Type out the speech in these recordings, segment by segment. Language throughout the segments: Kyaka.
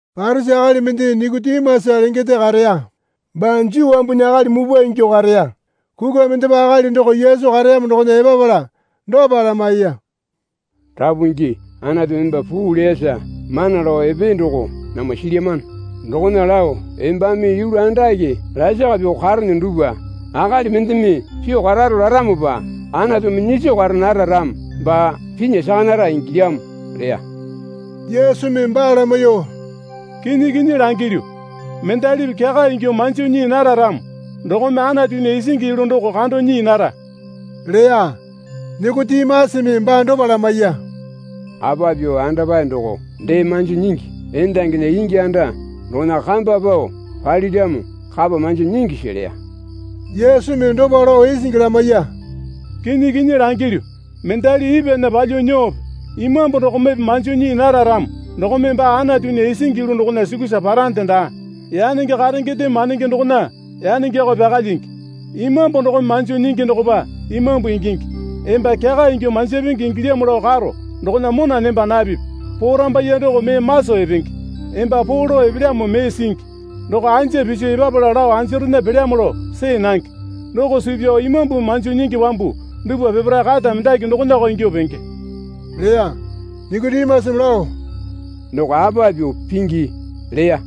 Parisi akali mende Nikotimasa lengende kareya. Baa Juu wambunya akali mupwa ingyuo kareya. Kukwa mendepa akali doko Yesu kareyamo dokona epapala dopa lamaiya. Rapu Pingi Anatumi emba puu leyasa mana lao epee doko namwa silyamano. Dokona lao embame yulu andake lasaka pyuo karene dupwa akali mendeme pyuo kararo laramopa Anatumi nyiso kara nara ramo baa pinya saka nara ingilyamo leya. Yesumi baa lamaiyuo, Kinyi kinyi langilyu, mendalipi kyaka ingyuo manjo nyii nara ramo dokome Anatunya isingi yulu doko kando nyii nara leya. Nikotimasame baa dopa lamaiya. Apa pyuo andapae doko dee manjo nyingi? Endanginya ingi anda dokona kamba pao paliramo kapa manjo nyingisi? leya. Yesumi dopa lao isingi lamaiya. Kinyi kinyi langilyu, mendali ipwana palyuo nyuope Imambu dokomepe manjo nyii nara ramo dokome baa Anatunya isingi yulu dokona sukusa parande daa. Yanenge karengendeme mandenge dokona yanengeko pyaka lyingi. Imambu dokome manjo nyingi dokopa imambu ingingi. Emba kyaka ingyuo manjapenge ingilyamo lao karo dokona mona nemba napipi. Porambaiye doko mee maso epenge. Emba poo lao epelyamo mee singi. Doko anja piso epapala lao anjarena pelyamo lao see nange. Doko suu pyao Imambumi manjo nyingi wambu dupwa peparae kata mendaki dokonako ingyuo penge leya. Nikotimasame lao, Doko apa pyuo pingi? leya.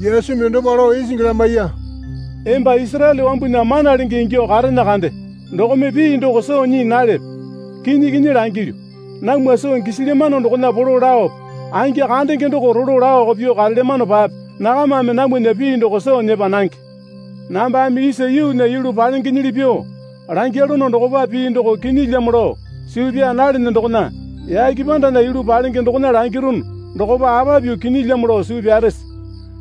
Yesumi dopa lao isingi lamaiya. Emba Isaraele wambunya mana lenge ingyuo karene kande dokome pii doko soo nyii nalepe? Kinyi kinyi langilyu, namwa soo gisilyamano dokona polo laope, angi kandenge doko rolo laoko pyuo karelyamanopape nakamame namwana pii doko soo nyepa nange. Nambame isa yuunya yulu palengenyili pyuo langyalono dokopa pii doko kinyilyamo lao suu pyaa nalene dokona yake pandana yulu palenge dokona langirunu dokopa apa pyuo kinyilyamo lao suu pyarese?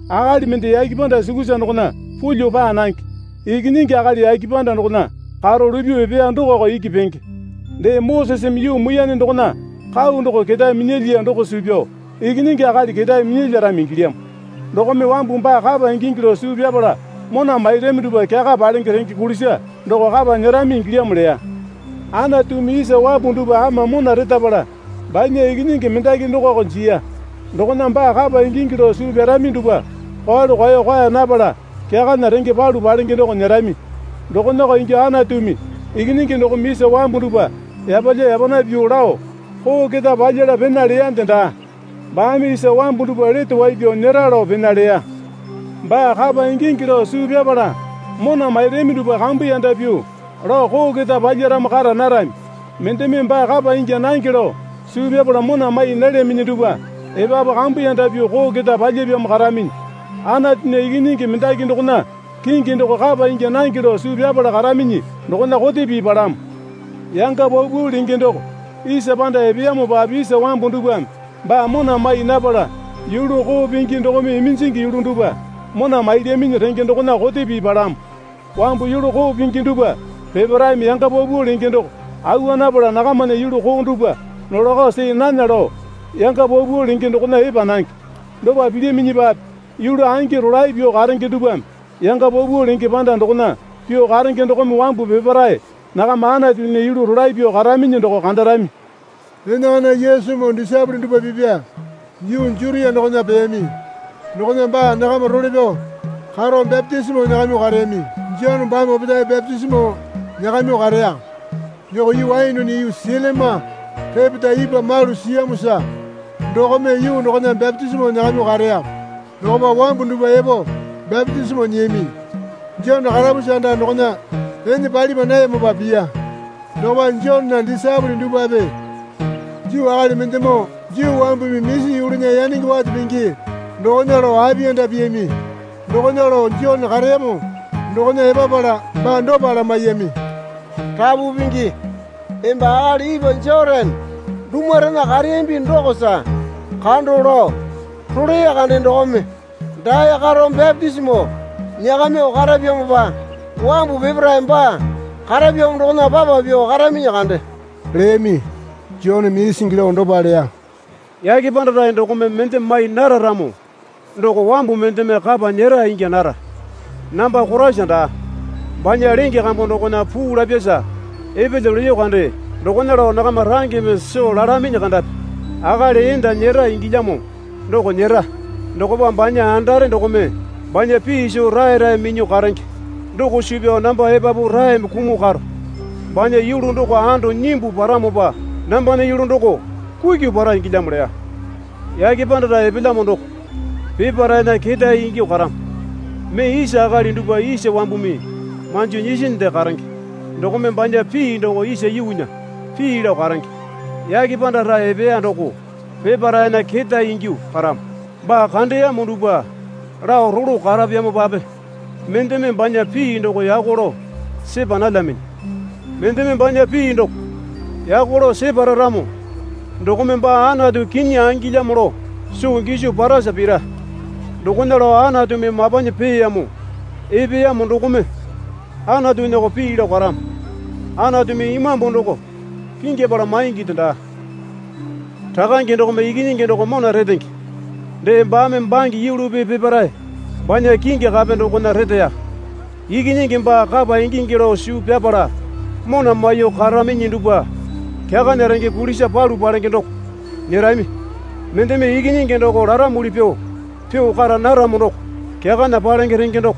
Akali mende yake panda sukusa dokona pulyuo paa nange. Ikinyingi Akali yake panda dokona karo lupyuo epeya dokoko iki penge. Dee, Moseseme yuu muiyane dokona kau doko ketae minyalyiya doko suu pyao Ikinyingi Akali ketae minyalyarami ingilyamo. Dokome wambu baa kapa ingingi lao suu pyapala mona mairami dupwa kyaka palenge renge kulisa doko kapa nyerami ingilyamo leya. Anatumi isa wambu dupwa ama mona retapala banya Ikinyingi mendaki dokoko jiya. Dokona baa kapa ingingi lao suu pyarami dupwa kwalu kwao kwaa napala kyakana renge palu palenge doko nyerami. Dokonako ingyuo Anatumi Ikinyingi dokome isa wambu dupwa yapalya yapana pyuo lao koo keta palyala pena leyande daa. Baame isa wambu dupwa lete wai pyao nyera lao pena leya. Baa kapa ingingi lao suu pyapala mona mairami dupwa kambuyanda pyuo lao koo keta palyaramo kara narami. Mendeme baa kapa ingya nange lao suu pyapala mona mai nalyaminyi dupwa epapu kambuyanda pyuo koo keta palyapyamo karaminyi. Anatunya Ikinyingi mendaki dokona kingi doko kapa ingya nange lao suu pyapala karaminyi dokona kote pii palamo. Yanga paupau lenge doko isa panda epeyamopape isa wambu dupwame baa mona mai napala yulu koo pingi dokome iminjingi yulu dupwa mona mailyaminyi renge dokona kote pii palamo. Wambu yulu koo pingi dupwa peparaeme yanga paupau lenge doko awa napala nakamana yulu koo dupwa nolako see nana lao yanga paupau lenge dokona epa nange. Dopa pilyaminyipape yulu angi rolae pyuo karenge dupwame yanga paupau lenge panda dokona pyuo karenge dokome wambu peparae nakama Anatunya yulu rolae pyuo karaminyi doko kandarami. Enakana Yesumoo disaepole dupwa pipya yuu Jutia dokona peyami. Dokona baa nakama role pyao karo bapitisimo nyakamyuo kareyami. Jone baame opetae bapitisimo nyakamyuo kareya. Doko yuu Ainone yuu Selima repeta ipwa malu siyamosa dokome yuu dokona bapitisimo nyakamyuo kareya. Dokopa wambu dupwa epo bapitisimo nyiyami. (Jone karapusi anda dokona ene palipa nayamopa piya.) Dokopa Jonena disaepole dupwape Juu akali mendemoo Juu wambumi misi yulunya yanenge wate pingi dokona lao apiyanda piyami. Dokona lao Jone kareyamo dokona epapala baa dopa lamaiyami. Rapu Pingi, emba akali ipwa Jotane dumurena kareyambi dokosa kando lao rolee kande dokome dae karo bapitisimo nyakamyuo karapyamopa wambu peparae baa karapyamo dokona papa pyuo karaminyi kande, leyami. Joneme isingi lao dopa leya. Yake panda rae dokome mende mai nara ramo doko wambu mendeme kapa nyera ingya nara. Namba Koraisa daa. Banya lenge kambu dokona puu lapyasa epelyo leyo kande dokona lao nakama rangeme soo lalaminyi kandapi. Akali enda nyera ingilyamo doko nyera. Dokopa banya andare dokome banya pii soo raerae minyuo karenge doko suu pyao namba epapu raeme kumuo karo. Banya yulu doko ando nyimbu paramopa nambana yulu doko kukyu para ingilyamo leya. Yake panda rae epelyamo doko peparaena ketae ingyuo karamo. Mee isa akali dupwa isa wambumi manjo nyisinde karenge dokome banya pii doko isa yuunya pii lao karenge. Yake panda rae epeya doko peparaena ketae ingyuo karamo. Baa kandeyamo dupwa lao rolo karapyamopape mendeme banya pii doko yako lao sepa nalyaminyi. Mendeme banya pii doko yako lao separa ramo dokome baa Anatu kinyi angilyamo lao soo giso parasa pira. Dokona lao Anatumi mapanyi peeyamo epeyamo dokome Anatunyako pii lao karamo. Anatumi Imambu doko pingyapala mainginde daa. Rakange dokome Ikinyingi doko mona retenge, dee, baame bange yulupi peparae banya kingi kape dokona reteya. Ikinyingi baa kapa ingingi lao suu pyapala mona maiyuo karaminyi dupwa kyakana renge kulisa palu palenge doko nyerami. Mendeme Ikinyingi doko laramuli pyuo pyuo kara naramo doko kyakana palenge renge doko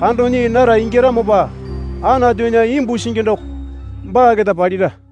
kando nyii nara ingyaramopa Anatunya imbu singi doko baa keta palira.